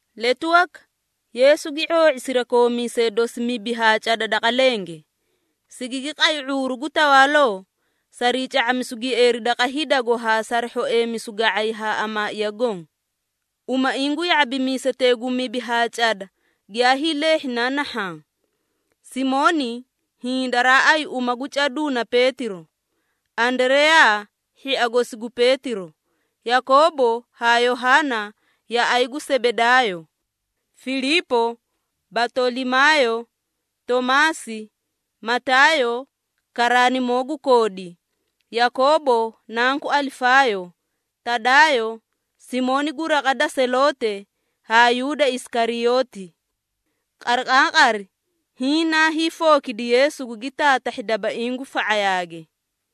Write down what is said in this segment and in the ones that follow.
Letu waka, Yeesu gi ⁄oo⁄i sirakoomiisee dosi mibi haa cada daqa lenge, sigigi qay ⁄uuru gu tawaaloo sarii ca⁄amisuu gieeri daqa hidago haa sari hhoeemisu ga⁄ay haa amaaiya goõ. Umaiĩ gu ya⁄abimiisetee gu mibi haa cada giyaa hiileehhi na nahhaã: Simooni (hiĩ daraa ayi uma gu caduu na Peetiro), Andareyaa hhia gosi gu Peetiro, Yakoobo haa Yohaana yaꞌay gu Sebedaayo, Filiipo, Batolimaayo, Toomaasi, Mataayo karaanimoo gu koodi, Yakoobo nanku Alifaayo, Tadaayo, Simooni gu raqa da Seloote, haa Yuuda Isikariyooti. Qariqaaqari hiĩ naa hiifookidi Yeesu gugi taatahhi dabaiĩ gu fa⁄ayaage.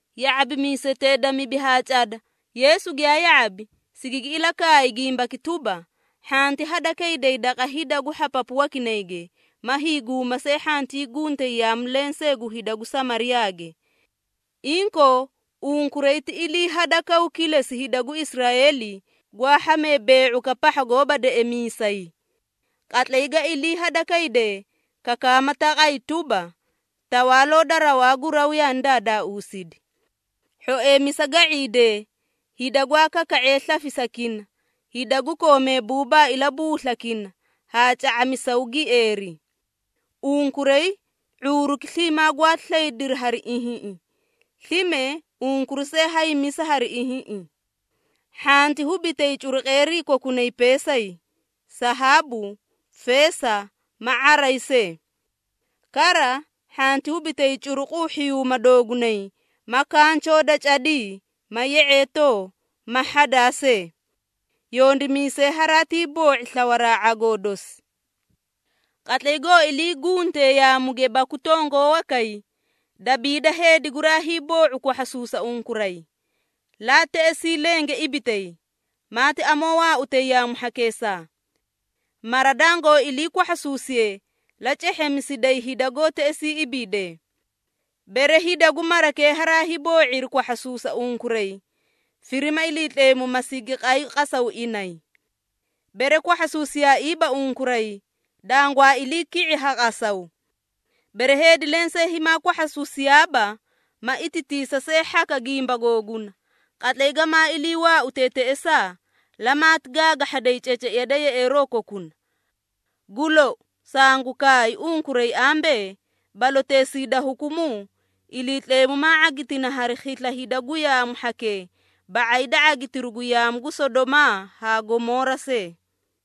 Ya⁄abimiisetee da mibi haa cada, Yeesu giyaa ya⁄abi, sigigi ilakaay gimbaki tuba, “Hhanti hada kayday daqa hida gu hhapapu wakinayge ma hiiguuma see hhantii guntay yaamu lensee gu hida gu Samariyaage. Inkoo, unkuray ti ilii hadakawuu kilesi hida gu Israeeli gwaa hhamee bee⁄ukaꞌa pahha goóba deꞌemiisay. Qatlay ga ilii hada kaydee, kakaama taqay tuba, ‘Tawaaloo da rawaa gu raw yaani daadaausidi.’ Hhoeemisa ga⁄iidee, hida gwaa kaka⁄ee slafisakina, hida gu koomee buubaa ilabuuslakini haa ca⁄amisaw gieeri. Unkuray ⁄uuruki sliimaa gwaati slaydiri hari ihiĩꞌi, slime unkuray see haymisa hari ihiĩꞌi. Hhanti hubitay curuqeerii kokunay peesay, sahaabu, feesa ma ⁄aray see. Kara, hhanti hubitay curuquu hhiyuuma doogunay ma kanchoo da cadii, ma ye⁄eetoo, ma hhadaa see. Yondimiisay haraatii boo⁄i slawaraa ⁄agoo dosi. Qatlay goo ilii guntee yaamuge baku tongoo wakay, dabiida heedi guraa hiiboo⁄u kwahhasuusa unkuray, laa teꞌesii lenge ibitay, maati amoo waautay yaamu hhakeesaa. Mara dangoó ilii kwahhasuusiye, la cehheemisiday hida goó teꞌesii ibiidee. Bere, hida gu marakee haraa hiiboo⁄iri kwahhasuusa unkuray, firima Iliitleemu ma sigi qay qasaw inay. Bere kwahhasuusiyaaiiba unkuray, dangwaa ilii ki⁄i ha qasawkee. Bere heedi lensee himaa kwahhasuusiyaaba, ma itatiisa see hhaka gimba googuna, qatlay gamaa ilii waautee teꞌesaa, lamaati gaagahhaday ceceiya da yeꞌeeroo kokuna. Gu lou, sangu kaay unkuray ambee, baloteesii da hukumuu, Iliitleemu maa ⁄agitina hari khisla hida gu yaamu hhakee ba⁄ay da ⁄agitiru gu yaamu gu Sodomaa haa Gomoora see!”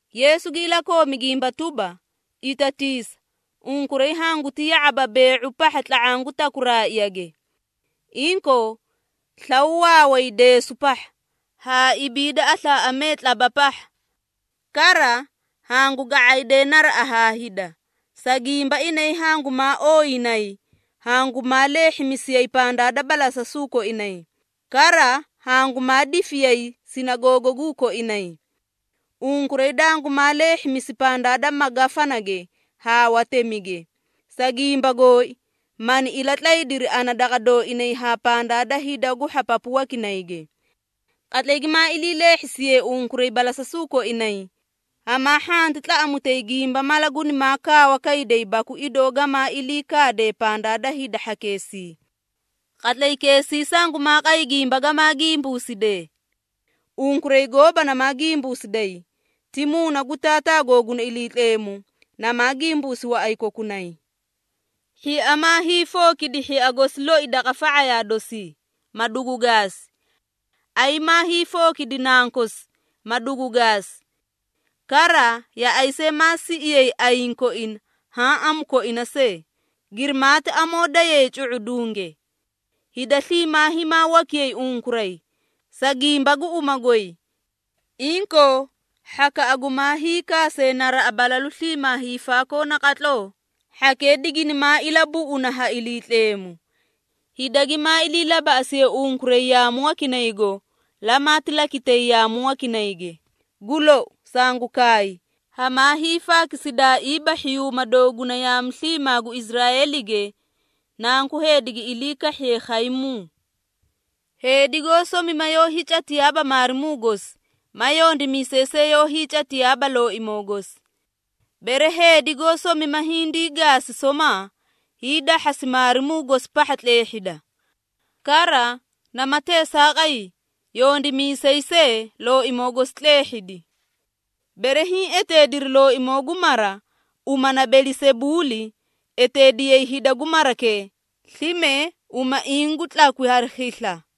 Yeesu gi ilakoomi gimba tuba, “Itatiisa! Unkuray hanguti ya⁄aba bee⁄u pahha tla⁄aã gu takuraaꞌage. Inkoo, slaw waaway deesu pahha, haa ibiida aslaaꞌamee tlaba pahha! Kara, hangu ga⁄aydee naraꞌa haa hida, sa gimba inay hangumaa ooyinayi, hangumaa leehhimisiyay pandaa da balasasuu koinay, kara hangumaa difiyay sinagoogaguu koinay. Unkuray dangumaa leehhimisi pandaa da magafanage haa watemige, sa gimba gooi, mani ilatlaydiri ana daqa dooinay haa pandaa da hida gu hhapapu wakinayge. Qatlay gimaa ilii leehhisiyee unkuray balasasuu koinay, hamaa hhanti tlaꞌamutay gimba mala gunimaa kaawa kayday baku idoo gamaa ilii kaadee pandaa da hida hhakeesii. Qatlaykeesii sangumaa qay gimba gamaa gimbuusidee. Unkuray gooba namaa gimbuusiday, ti Muuna gu Taataa googuna Iliitleemu, namaa gimbuusi waꞌay kokunay. Hhia maa hiifookidi hhia gosi loi daqa fa⁄ayaa dosii, ma dugu gaasi. Ayi maa hiifookidi nankosi, ma dugu gaasi. Kara, yaꞌay see maa siꞌiyay ayiĩ koina haã amu koina see, girimaati amoo dayay cu⁄udunge. Hida sliimaa himaa wakiyay unkuray, sa gimba gu uma goy. Inkoo hhakaꞌa gumaa hiikaasee naraꞌa balalu sliimaa hiifaakoo naqatloo, hhakee diginimaa ilabuꞌuna ha Iliitleemu. Hida gimaa ilii labaꞌasiyee unkuray yaamu wakay, lamaati lakitay yaamu wakinayge. Gu lou, sangu kaay, hamaa hiifaakisidaaiiba hhiyuuma dooguna yaamu sliimaa gu Israeelige, Nanku Heedi gi ilii kahhiye khaymuu. Heedi goó somima yoó hiicatiyaaba maarimuu gosi ma yondimiisay see yoó hiicatiyaaba looimoo gosi. Bere heedi goó somima hindii gaasi somaa, hiidahhasi maarimuu gosi pahha tleehhida. Kara, nama teesaaqay yondimiisay see looimoo gosi tleehhidi. Bere hiĩ eteediri looimoo gu mara uma na Belisebuuli, eteediyay hida gu marakee, slime umaiĩ gu tlakwi hari khisla!”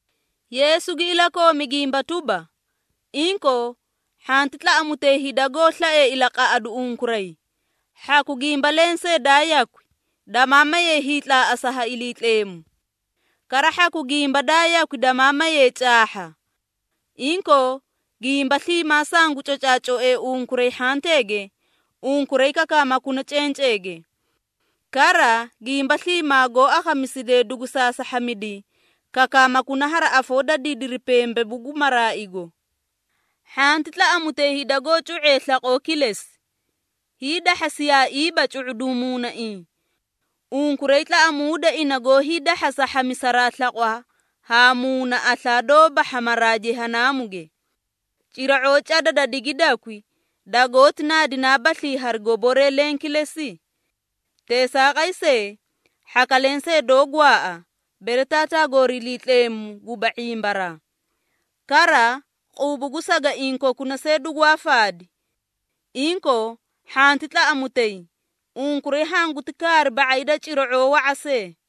Yeesu gi ilakoomi gimba tuba, “Inkoo, hhanti tlaꞌamutay hida goó slaee ilaqaꞌadu unkuray, hhaku gimba lensee daa yakwi, damaa maye hiitlaaꞌasa ha Iliitleemu. Kara hhaku gimba daa yakwi damaa maye caahha. Inkoo, gimba sliimaa sangu cocaacoe unkuray hhanteege, unkuray kakaamakuna cenceege. Kara gimba sliimaa goó akhamisidee dugu saasahhamidi, kakaamakuna hari afoo da didiri pembebu gu maraaigo. Hhanti tlaꞌamutay hida goó cu⁄ee slaqoo kilesi, hiidahhasiyaaiiba cu⁄uduũ muunaiĩ. Unkuray tlaꞌamuuda ina gu hiidahhasa hhamisaraa slaqwa haa muuna aslaa doóba hhamaraa Jehanaamuge. Cira⁄oo cada da digidakwi, dagoóti naadinaabaslii hari goboree leẽ kilesi? Teesaaqay see, hhaka lensee doó gwaaꞌa, bere Taataa goori Iliitleemu guba ⁄imbaraa. Kara, quubu gu sagaiĩ kokuna see dugwaa faadi. Inkoo, hhanti tlaꞌamutay! Unkuray hanguti kaari ba⁄ay da cira⁄oo wa⁄a see!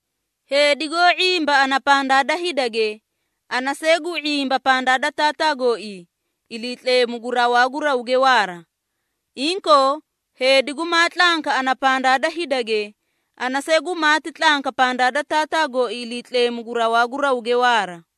Heedi goó ⁄imba ana pandaa da hidage, ana see gu ⁄imba pandaa da Taataa gooii, Iliitleemu gu rawaa gu rawge waara. Inkoo, heedi gumaa tlanka ana pandaa da hidage, ana see gumaati tlanka pandaa da Taataa gooii Iliitleemu gu rawaa gu rawge waara.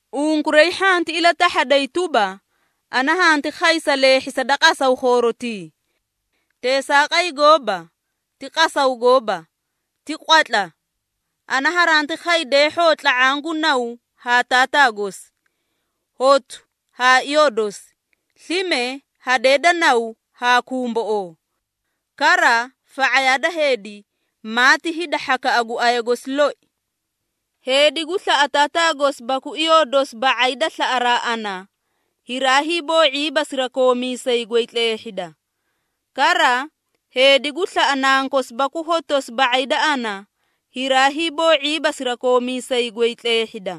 Unkuray hhanti ilatahhaday tuba, ana hanti khay sa leehhisa da qasaw khoorotii. Teesaaqay gooba! Ti qasaw gooba, ti qwatla. Ana haranti khay deehhoo tla⁄aã gu naw haa taataa gosi, hotu haa iyoo dosi, slime hadee da naw haa kumboꞌoo. Kara, fa⁄ayaa da heedi, maati hida hhakaꞌa gu aya gosi loi. Heedi gu slaꞌa taataa gosi baku iyoo dosi ba⁄ay da slaꞌaraa ana, hiraa hiiboo⁄iiba sirakoomiisay goy tleehhida. Kara, heedi gu slaꞌa nankosi baku hotosi ba⁄ay da ana, hiraa hiiboo⁄iiba sirakoomiisay goy tleehhida.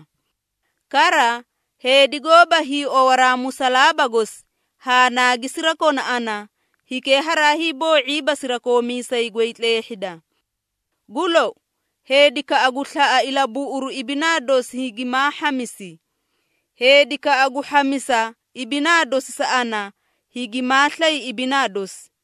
Kara, heedi goóba hiiowaraa musalaaba gosi haa naagi sirakona ana, hikee haraa hiiboo⁄iiba sirakoomiisay goy tleehhida. Gu lou, heedikaꞌa gu slaꞌa ilabuꞌuru ibinaa dosi higimaa hhamisi. Heedikaꞌa gu hhamisa ibinaa dosi sa ana, higimaa slay ibinaa dosi.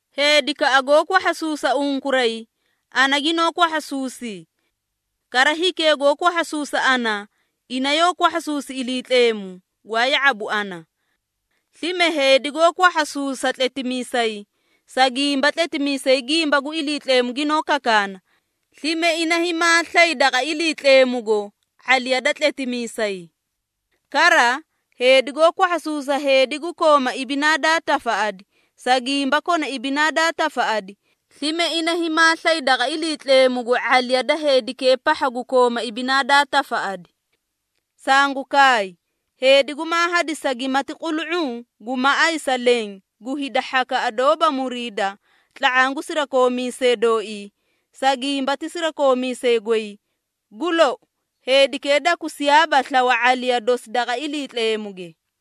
Heedikaꞌa goó kwahhasuusa unkuray, ana ginoó kwahhasuusi. Kara hikee goó kwahhasuusa ana, ina yoó kwahhasuusi Iliitleemu, gwaa ya⁄abu ana. Slime heedi goó kwahhasuusa tletimiisay, sa gimba tletimiisay gimba gu Iliitleemu ginoó kakaana, slime ina himaa slay daqa Iliitleemugo ⁄aliya da tletimiisay. Kara, heedi goó kwahhasuusa heedi gu kooma ibinaa daa tafaꞌadi, sa gimba kona ibinaa daa tafaꞌadi, slime ina himaa slay daqa Iliitleemugo ⁄aliya da heedikee pahha gu kooma ibinaa daa tafaꞌadi. Sangu kaay, heedi gumaa hadisa gimati qulu⁄uu gu maꞌay sa leẽ gu hida hhanki doóba muriida tla⁄aã gu sirakoomiisee dooii, sa gimba ti sirakoomiisay goy, gu lou, heedikee dakusiyaaba slawa ⁄aliya dosi daqa Iliitleemuge.”